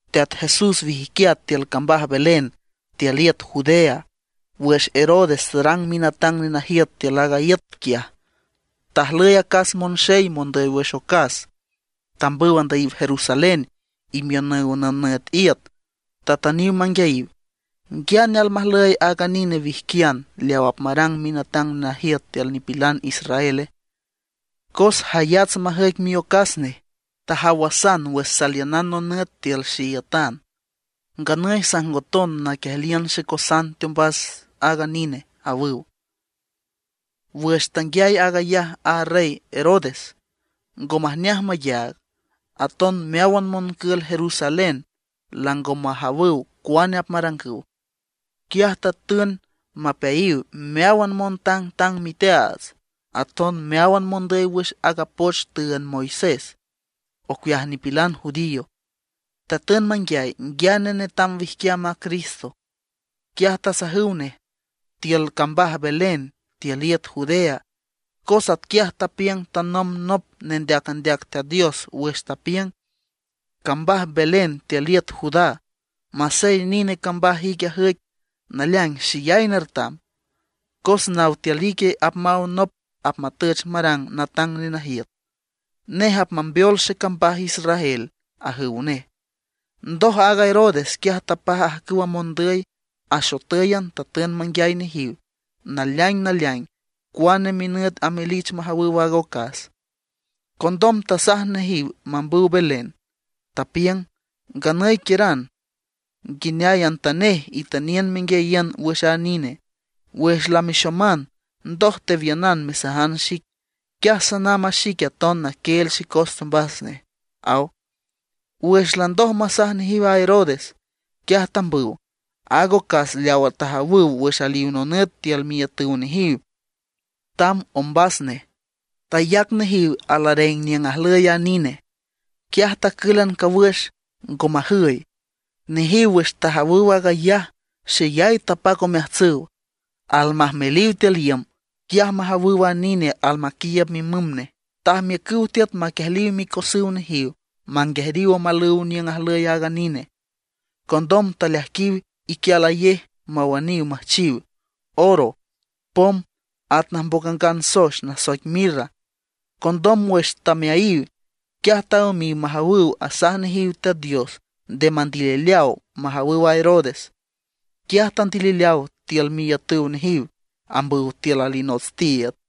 Teat Jesús wijquiat tiül cambaj Belén tiül iüt Judea wüx Herodes tarang minatang nenajiüt tiül aaga iüt quiaj. Tajlüy acas monxey mondüy wüx ocas tambüw andüyiw Jerusalén imiünüw nonüt iüt. Tatüniw manguiayiw: ―¿Nguiane almajlüy aaga nine wijquian leaw apmarang minatang nenajiüt tiül nipilan israele? Cos jayats majüic miocas nej; tajawasan wüx saliünan nonüt tiül xeiütan. Nganüy sajngoton naquiejliün xecosan teombas aaga nine ―awüw. Wüx tanguiay aag ayaj a Rey Herodes, ngo majneaj mayaag, aton meáwan moncül Jerusalén lango majawüw cuane apmarangüw. Quiaj tatün mapeayiw meáwan montangtang miteaats, aton meáwan mondüy wüx aaga poch tüünd Moisés ocueaj nipilan judío. Tatün manguiay nguiane netam wijquiam a Cristo. Quiaj tasajüw nej: ―Tiül cambaj Belén tiül iüt Judea, cos atquiaj tapiüng tanomb nop nendeac andeac Teat Dios wüx tapiüng: Cambaj Belén tiül iüt Judá, masey nine cambaj ic ajüic, naleaing xeyay nertam; cos naw tiül ique apmaw nop apmatüch marang natang nenajiüt, nej apmambeol xecambaj Israel―ajüw nej. Ndoj aaga Herodes quiaj tapaj ajcüwa mondüy, axotǘyan tatün manguiay nejiw naleaing naleaing cuane minüt amelich majawüw aaga ocas. Condom tasaj nejiw mambüw Belén, tapiüng: ―Nganüy quiüran, nguineayantanej itüniün menguiayiün wüx a nine. Wüx lamexoman, ndoj tewiünan mesajan xic, quiaj sanamb a xique aton naquieel xecos teombas nej ―aw. Wüx landoj masaj nejiw a Herodes, quiaj tambüw. Aaga ocas leawa tajawüw wüx aliw nonüt tiül miiütüw nejiw tamb ombas nej. Tayac nejiw alareng niüng ajlüy a nine; quiaj tacǘlan cawüx, ngo majüy. Nejiw wüx tajawüw aag ayaj xeyay tapac omeajtsüw. Almajmeliw tiül iüm, quiaj majawüw a nine almaquiiüb mimüm nej. Tajmiücüw tiüt maquiejliw micosüw nejiw manguejriw omalüw niüng ajlüy aaga nine. Condom taleaijquiw iquialayej mawüniw müjchiw oro, pom, at najmboc angan soex nasoic mirra. Condom wüx tameayiw, quiaj taümiw majawüw asaj nejiw Teat Dios nde mandilileaw majawüw a Herodes. Quiaj tandilileaw tiül miiütüw nejiw, ambüw tiül alinots tiiüd.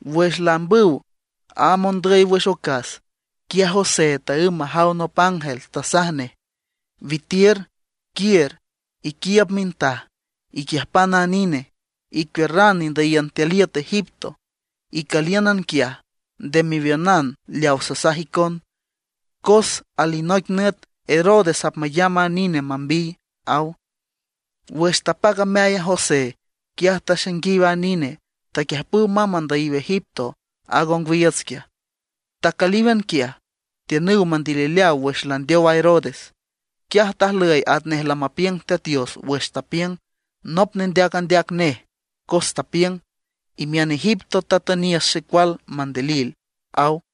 Wüx laambüw a mondüy wüx ocas, quiaj José taǘm majaw nop ángel tasaj nej: ―Witiür, quiür, iquiiüb mintaj, iquiüjpan a nine, icuiürran indüyiün tiül iüt Egipto. Icülíünan quiaj, nde mewiünan leaw sasaj icon, cos alinoic nüt Herodes apmayamb a nine mambiy ―aw. Wüx tapac ameay a José, quiaj taxainguiw a nine, taquiüjpüw mamb andüy Egipto aaga ongwiiüts quiaj. Tacülíwan quiaj. Tiünüw mandilileaw wüx landeow Herodes. Quiaj tajlüy atnej lamapiüng Teat Dios wüx tapiüng nop nendeac andeac nej, cos tapiüng: “Imiün Egipto tatüniüs xecual mandilil”, aw.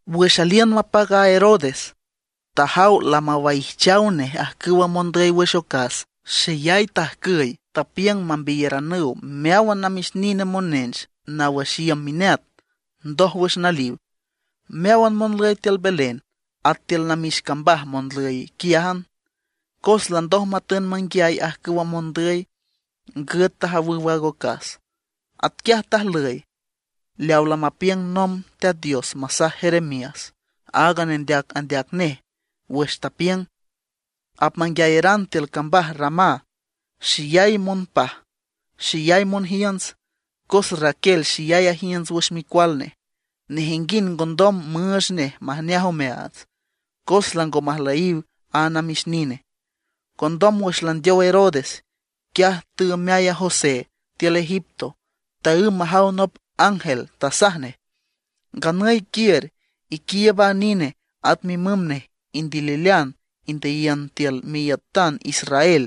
Wüx aliün mapac a Herodes, tajaw lamawaijchaw nej ajcüwa mondüy wüx ocas, xeyay tajcüy. Tapiüng mambiyaranüw meáwan namix nine monench naw wüx iüm mineat, ndoj wüx naliw, meáwan monlüy tiül Belén, at tiül namix cambaj monlüy quiájan. Cos landoj matün manguiay ajcüwa mondüy, ngüt tajawüw aaga ocas. Atquiaj tajlüy leaw lamapiüng nomb Teat Dios masaj Jeremías aaga nendeac andeac nej, wüx tapiüng: Apmanguiayaran tiül cambaj Ramá, xeyay monpaj, xeyay monjiünts; cos Raquel xeyay ajiünts wüx micual nej. Nejinguind ngondom müüch nej majneaj omeaats, cos lango majlüyiw a namix nine. Condom wüx landeow Herodes, quiaj teümeay a José tiül Egipto, taǘm majaw nop ángel tasaj nej: ―Nganüy quiür, iquiiüb a nine at mimüm nej, indililean indüyiün tiül miiütan Israel,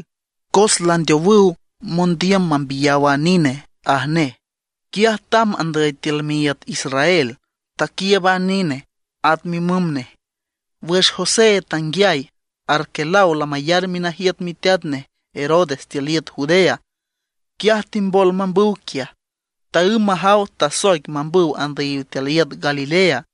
cos landeowüw mondiüm mambiyaw a nine ―aj nej. Quiaj tamb andüy tiül miiüt Israel, taquiiüb a nine, at mimüm nej. Wüx José tanguiay Arquelao lamayar minajiüt miteat nej Herodes tiül Judea, quiaj timbol mambüw quiaj. Taǘm majaw tasoic mambüw andüyiw tiül iüt Galilea.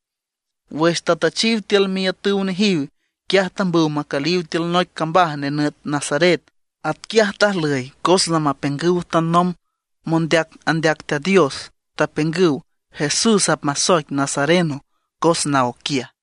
Wüx tatüchiw tiül miiütüw nejiw, quiaj tambüw macüliw tiül noic cambaj nenüt Nazaret. Atquiaj tajlüy cos lamapiüngüw tanomb mondeac andeac Teat Dios. Tapiüngüw Jesús apmasoic Nazareno cos naw quiaj.